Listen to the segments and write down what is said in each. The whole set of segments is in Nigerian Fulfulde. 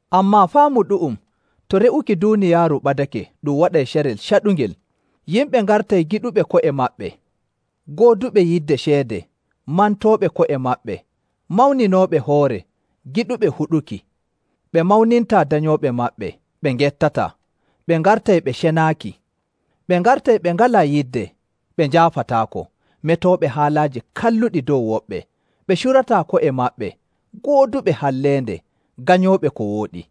Ammaa faamu ɗu'um, to re'uki duuniyaaru ɓadake, ɗum waɗay carel caɗungel. Yimɓe ngartay giɗuɓe ko'e maɓɓe, gooduɓe yidde ceede, mantooɓe ko'e maɓɓe, mawninooɓe hoore, giɗuɓe huɗuki, ɓe mawnintaa danyooɓe maɓɓe, ɓe ngettataa, ɓe ngartay ɓe cenaaki. Ɓe ngartay ɓe ngalaa yidde, ɓe njaafataako, metooɓe haalaaji kalluɗi dow woɓɓe, ɓe curataa ko'e maɓɓe, gooduɓe halleende, ganyooɓe ko wooɗi.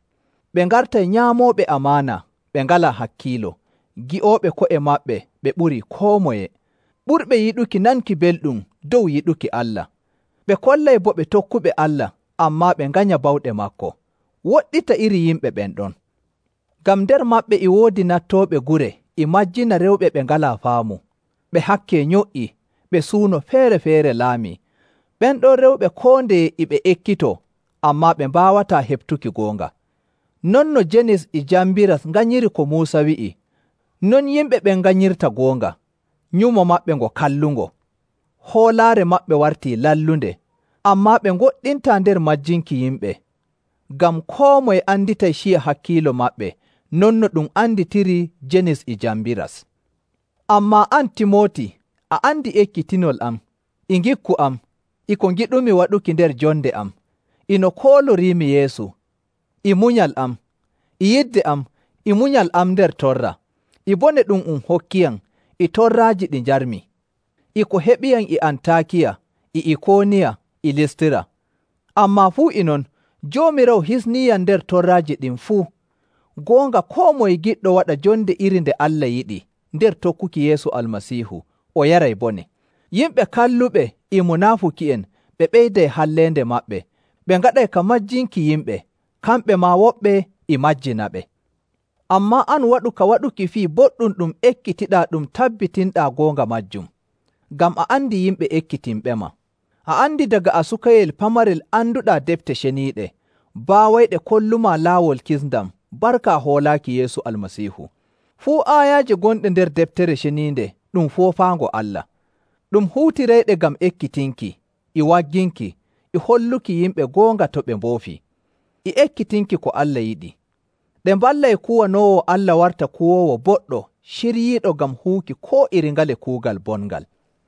Ɓe ngartay nyaamooɓe amaana, ɓe ngalaa hakkiilo, ngi'ooɓe ko'e maɓɓe ɓe ɓurii koo moye, ɓurɓe yiɗuki nanki belɗum dow yiɗuki Allah. Ɓe kollay bo ɓe tokkuɓe Allah, ammaa ɓe nganya bawɗe maako. Woɗɗita iri yimɓe ɓen ɗon. Ngam nder maɓɓe e woodi nattooɓe gure e majjina rewɓe ɓe ngalaa faamu, ɓe hakke nyo''i, ɓe suuno feere‑feere laamii. Ɓen ɗon rewɓe koo ndeye e ɓe ekkitoo, ammaa ɓe mbaawataa heɓtuki goonga. Non no Jenis e Jambiras nganyiri ko Muusa wi'i, non yimɓe ɓen nganyirta goonga. Nyumo maɓɓe ngo kallungo, hoolaare maɓɓe wartii lallunde. Ammaa ɓe ngoɗɗintaa nder majjinki yimɓe, ngam koo moye anditay ciya hakkiilo maɓɓe non no ɗum anditiri Jenis e Jambiras. Ammaa an, Timooti, a andi ekkitinol am, e ngikku am, e ko ngiɗumi waɗuki nder jonde am, e no kooloriimi Yeesu, e munyal am, e yidde am, e munyal am nder torra, e bone ɗum um hokkiyam, e torraaji ɗi njarmi, e ko heɓiyam e Antaakiya e Ikooniya e Listira. Ammaa fuu e non, Joomiraawo hisniiyam nder torraaji ɗin fuu. Goonga koo moye giɗɗo waɗa jonde iri nde Allah yiɗi nder tokkuki Yeesu Almasiihu, o yaray bone. Yimɓe kalluɓe e munaafuki'en ɓe ɓeyday halleende maɓɓe ɓe ngaɗay ka majjinki yimɓe, kamɓe maa woɓɓe e majjinaɓe. Ammaa an waɗu ka waɗuki fii boɗɗum ɗum ekkitiɗaa ɗum tabbitinɗaa goonga maajum, ngam a andi yimɓe ekkitinɓema. A andi daga a sukayel pamarel anduɗaa defte ceniiɗe, baawayɗe kollumaa laawol kisndam barka hoolaaki Yeesu Almasiihu. Fuu aayaaje gonɗe nder Deftere Ceniinde ɗum foofaango Allah. Ɗum huutirayɗe ngam ekkitinki, e wagginki, e holluki yimɓe goonga to ɓe mboofii, e ekkitinki ko Allah yiɗi. Ɗe mballay kuwanoowo Allah warta kuwoowo boɗɗo ciryiiɗo ngam huwuki koo iri ngale kuugal bongal.